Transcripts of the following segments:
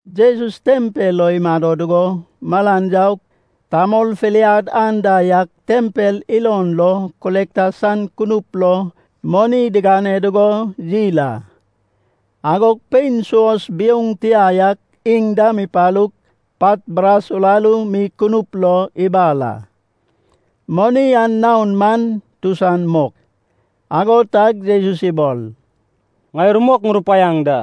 Jesus tempel lo imado dugo malan yaug, tamol filiad anda yak tempel ilon lo kolekta san kunup lo moni digane dugo yil a. Agog pein suos biouŋ tia yak iŋ dam ipalug pat bras uraru mi kunup lo ibal a. Moni an naon man tusan mok. Ago tag Jesus ibol, “Ŋai rumok ŋurupaiaŋ da.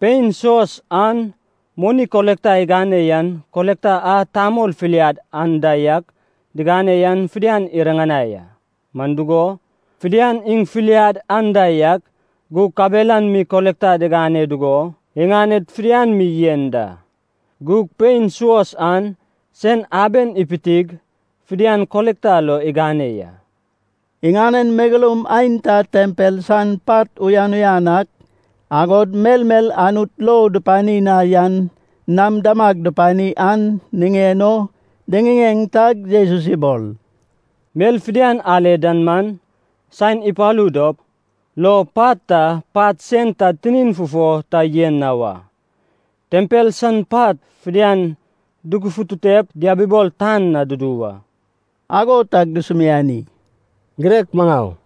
Pein suos an moni kolekta igane yan kolekta a tamol filiad anda yak digane yan fidian iriŋanai a. Man dugo, fidian iŋ filiad anda yak gug kabelan mi kolekta digane dugo iŋaned fidian mi yen da. Gug pein suos an sen aben ipitig fidian kolekta lo igane ya.” Iŋanen megeloum aenta tempel san pat uyan uyan ak, agod melmel Anut lou dupani na yan nam damag dupani an niŋen o diŋiŋeŋ tag Jesus ibol, “Mel fidian ale dan man, saen ipalu dop, lo pat ta pat sen ta tinin fufo ta yen na wa. Tempel san pat fidian dugufututep diabibol tan na dudu wa.” Ago tag dusumiani, “Girek maŋau,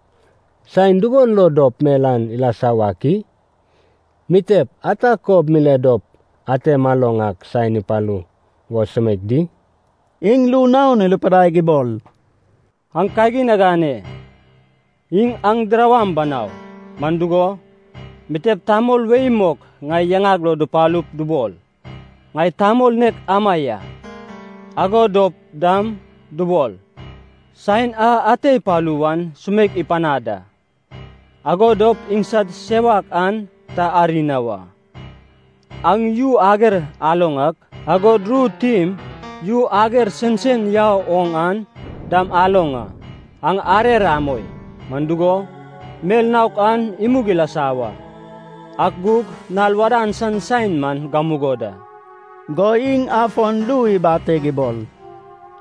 saen dugon lo dop mel an ilasa wak i? Mitep ata kob mile dop ate maloŋ ak saen an ipalu wo sumeik di?” Iŋ ru naon irupidaig ibol, “Aŋ kagin agane. Iŋ aŋ dirawaŋ banau. Man dugo, mitep tamol wei mok ŋai yaŋag lo dupalup dubol, ‘Ŋai tamol nek ama ya,’ ago dop dam dubol, ‘Saen a ate ipalu wan sumeik ipanad da.’ Ago dop iŋsad sewak an ta ari na wa. Aŋ yu ager aloŋ ak, agod ru tim yu ager sensen yau oŋ an dam aloŋ a. Aŋ arer amoi. Man dugo, mel naok an imug ilasa wa, ak gug nal wadan san saen man gamugo da.” Go iŋ afon ru ibateg ibol,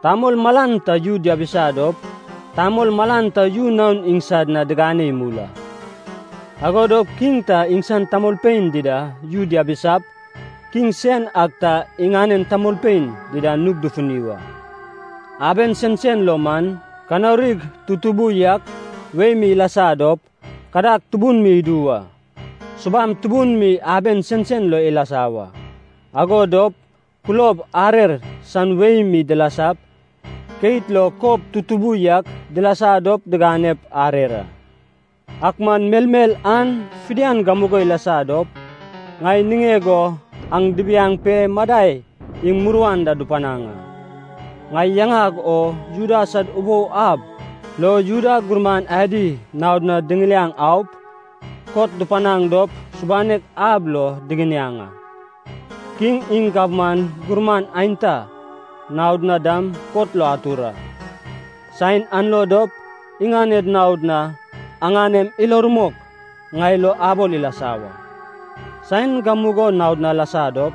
“Tamol malan ta yu diabisa dop, tamol malan ta yu naon iŋsad na digane imul a. Ago dop kiŋ ta iŋsan tamolpein dida yu diabisap, kiŋ sen ak ta iŋanen tamolpein dida nug dufuni wa. Aben sensen lo man, kanaurig tutubu yak wei mi ilasa dop, kadag tubun mi idu wa. Subam tubun mi aben sensen lo ilasa wa. Ago dop kulob arer san wei mi dilasap, keit lo kob tutubu yak dilasa dop diganep arer a. “Ak man melmel an fidian gamugo ilasa dop, ŋai niŋeg o aŋ dibiaŋ pe, madai iŋ muruan da dupanaŋ a. Ŋai yaŋag o Juda sad ubou ab lo Juda gurman adi naod na diŋiliaŋ aup, kot dupanaŋ dop subanek ab lo diginiaŋ a. Kiŋ iŋ gabman gurman aenta naod na dam kot lo atur a. Saen an lo dop iŋaned naod na aŋanem ilo rumok ŋai lo abol ilasa wa. Saen gamugo naod na alasa dop,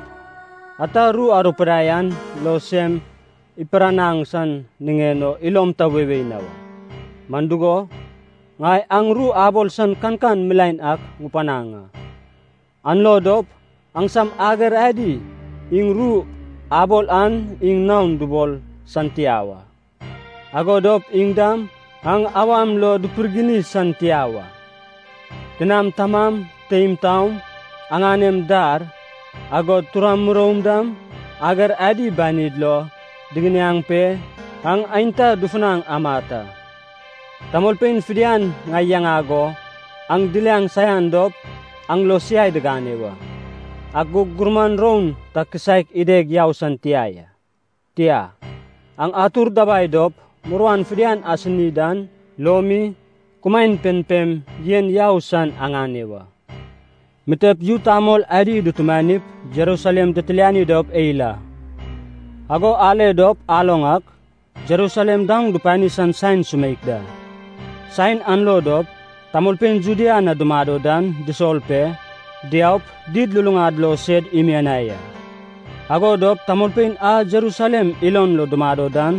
ata ru arupidaip an lo sem ipiranaŋ san niŋen o ilom ta weiwei na wa. Man dugo, ŋai aŋ ru abol san kankan milaen ak ŋupanaŋ a. An lo dop aŋsam ager adi iŋ ru abol an iŋ naon dubol san tia wa, ago dop iŋ dam aŋ awam lo dupirgini san tia wa. Tinam tamam, teim taom, aŋanem dar, agod turam muroum dam ager adi banid lo diginiaŋ pe, aŋ aenta dufunaŋ amat a. Tamolpein fidian ŋai yaŋag o aŋ diliaŋ saian dop aŋ lo siai digane wa. Ak gug gurmam roun ta kisaek ideg yau san tia ya. Tia, aŋ atur dabai dop muruan fidian asini dan lo mi, kumaen pempem yen yau san aŋane wa.” “Mitep yu tamol adi dutumanip Jerusalem ditiliani dop eil a. Ago ale dop aloŋ ak, Jerusalem daoŋ dupani san saen sumeik da. Saen an lo dop, tamolpein Judea na dumado dan disol pe, diaup, did luluŋad lo sed imianai a. Ago dop, tamolpein a Jerusalem ilon lo dumado dan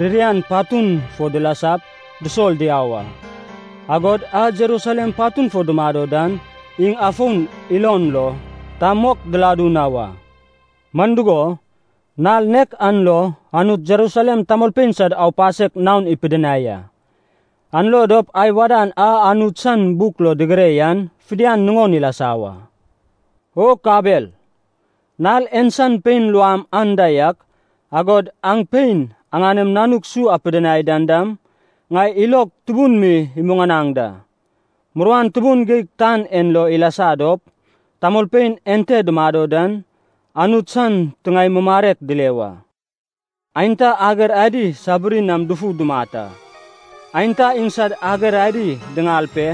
ririan patun fo dilasap dusol diau a, agod a Jerusalem patun fo dumado dan iŋ afon ilon lo ta mok diladu na wa. Man dugo, nal nek an lo, Anut Jerusalem tamolpein sad aupasek naon ipidinai a. An lo dop ai wadan a Anut san buk lo digire yan fidian nuŋon ilasa wa. O kabel, nal en san pein luam anda yak, agod aŋ pein aŋanem nanuk su apidinai dan dam, ŋai ilog tubun mi imuŋanaŋ da! Muruan tubun geig tan en lo ilasa dop, tamolpein ente dumado den Anut san tiŋae mumarek dile wa. Aenta ager adi sabiri nam dufu dumat a. Aenta iŋsad ager adi diŋal pe,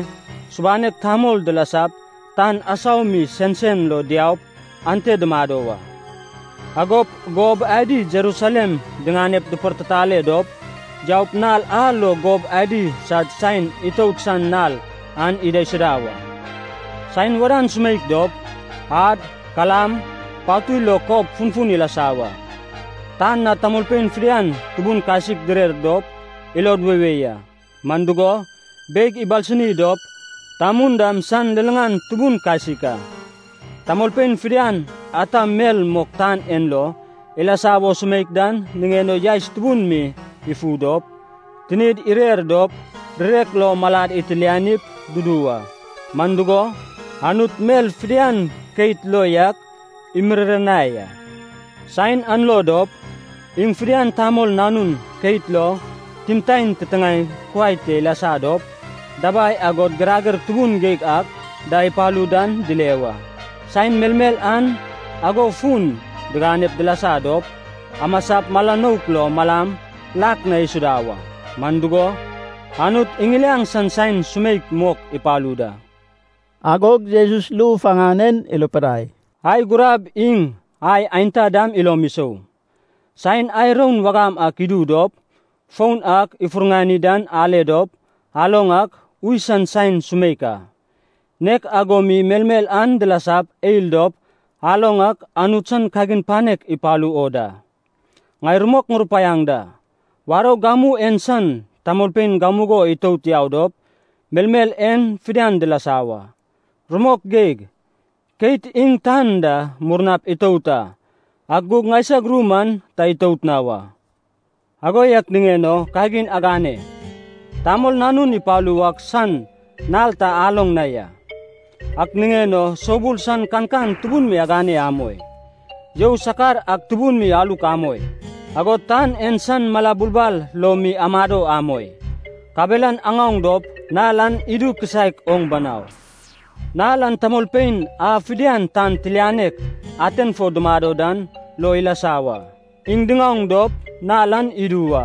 subanek tamol dilasap tan asau mi sensen lo diaup ante dumado wa. Agop gob adi Jerusalem diŋanep dipartitale dop yaup nal a lo gob adi sad saen itout san nal an idaisuda wa. “Saen wadan sumeik dop, ad, kalam, patui lo kob funfun ilasa wa. Tan na tamolpein fidian tubun kasik direr dop ilod weiwei a. Man dugo, beig ibalsini dop tamun dam san liliŋan tubun kasik a. Tamolpein fidian ata mel mok tan en lo ilasa wo sumeik dan niŋen o yaes tubun mi ifu dop, tinid irer dop, rirek lo malad itilianip dudu wa. Man dugo, Anut mel fidian keit lo yak imiriranai a. Saen an lo dop, iŋ fidian Tamol Nanun keit lo timtaen titiŋaem kuai te ilasa dop, dabai agod girager tubun geig ak da ipalu dan, dile wa. Saen melmel an ago fun diganep dilasa dop, amasap mala nouk lo malam lak na isuda wa. Man dugo, Anut iŋiliaŋ san saen sumeik mok ipalu da.” Agog Jesus ru faŋan en irupidai, “Ai gurab iŋ ai aenta dam ilom isou. Saen ai roud wagam ak idu dop, foun ak ifurŋani dan ale dop, aloŋ ak, ui san saen sumeik a. Nek ago mi melmel an dilasap eil dop aloŋ ak, Anut san kagin panek ipalu o da. “Ŋai rumok ŋurupaiaŋ da, warou gamu en san tamolpein gamugo itout yau dop melmel en fidian dilasa wa. Rumok geig, keit iŋ tan da murnap itout a, ak gug ŋaisag ru man ta itout na wa. “Ago yak niŋen o kagin agane! Tamol Nanun ipalu wak san nal ta aloŋ na ya. Ak niŋen o soubul san kankan tubun mi agane amoi. You sakar ak tubun mi aluk amoi. Agod tan en san mala bulbal lo mi amado amoi. Kabelan aŋaoŋ dop nal an idu kisaek oŋ banau. Nal an tamolpein a fidian tan tilianek aten fo dumado dan lo ilasa wa, iŋ diŋaoŋ dop nal an idu wa,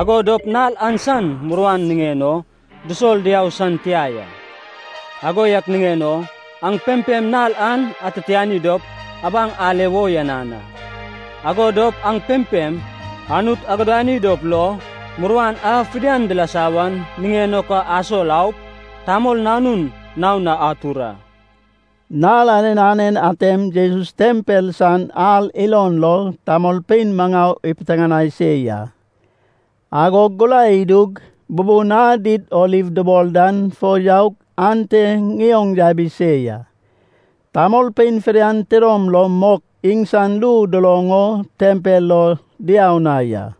ago dop nal an san muruan niŋen o disol diau san tia ya. Ago yak niŋen o aŋ pempem nal an atitiani dop abaŋ ale wo uyanan a. Ago dop aŋ pempem Anut agudani dop lo, muruan a fidian dilasa wan niŋen o ka asol aup, Tamol Nanun naon na atur a.” Nal anen anen atem Jesus tempel san ar ilon lo tamolpein maŋau ipiteŋanai se ya, agog gurai idug bubun a Did Oliv dubol dan fo yaug ante ŋioŋ yabi se ya. Tamolpein fidian tidom lom mok iŋsan ru duloŋ o tempel lo diau na ya.